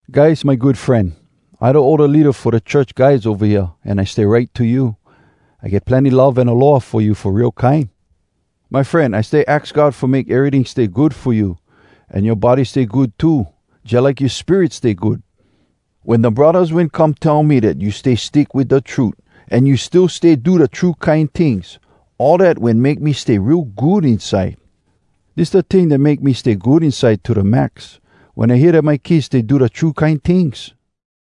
Gaius, my good fren, I da older leada fo da church guys ova hea, an I stay write to you. I get plenny love an aloha fo you fo real kine. My fren, I stay aks God fo make eryting stay good fo you, an yoa body stay good too, jalike yoa spirit stay good. Wen da braddahs wen come tell me dat you stay stick wit da trut, an you still stay do da true kine tings, all dat wen make me stay real good inside. Dis da ting dat make me stay good inside to da max: wen I hear dat my kids stay do da true kine tings.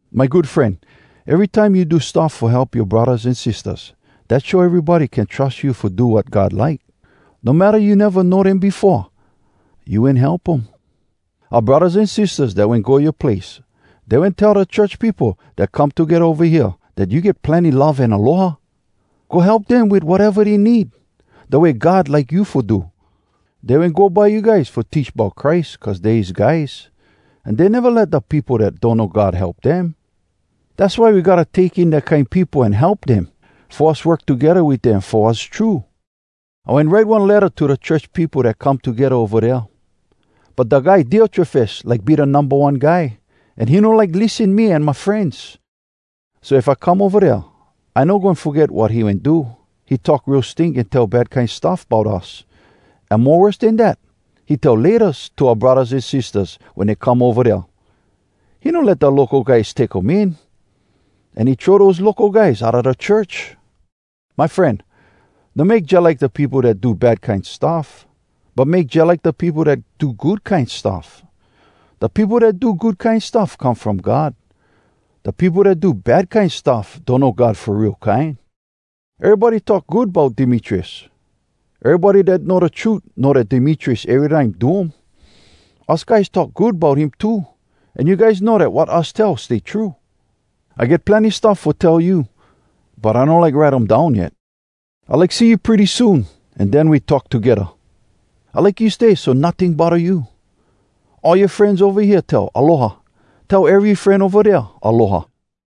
My good fren, erytime you do stuff fo help yoa braddahs an sistahs, dat show erybody can trus you fo do wat God like. No matta you neva know dem befo, you wen help um. Oua braddahs an sistahs dat wen go yoa place, dey wen tell da church peopo dat come togedda ova hea dat you get plenny love an aloha. Go help dem wit wateva dey need, da way God like you fo do. Dey wen go by you guys fo teach bout Christ cuz dey his guys, an dey neva let da peopo dat donno God help dem. Dass why we gotta take in dat kine peopo an help dem, fo us work togedda wit dem fo wass true. I wen write one letta to da church peopo dat come togedda ova dea, but da guy Diotrefes like be da Numba One Guy, an he no like lissen me an my frenz. So if I come ova dea, I no goin foget wat he wen do. He talk real stink an tell bad kine stuff bout us. An mo worse den dat, he tell “Laytas” to oua braddahs an sistahs wen dey come ova dea. He no let da local guys take um in, an he throw dose local guys outa da church. My fren, no make jalike da peopo dat do bad kine stuff, but make jalike da peopo dat do good kine stuff. Da peopo dat do good kine stuff come from God. Da peopo dat do bad kine stuff donno God fo real kine. Erybody talk good bout Demetrius. Erybody dat know da trut know dat Demetrius erytime do um. Us guys talk good bout him too, an you guys know dat wat us tell stay true. I get plenny stuff fo tell you, but I no like write um down yet. I like see you pretty soon, an den we talk togedda. I like you stay so notting bodda you. All yoa frenz ova hea tell, “Aloha.” Tell ery fren ova dea “Aloha.”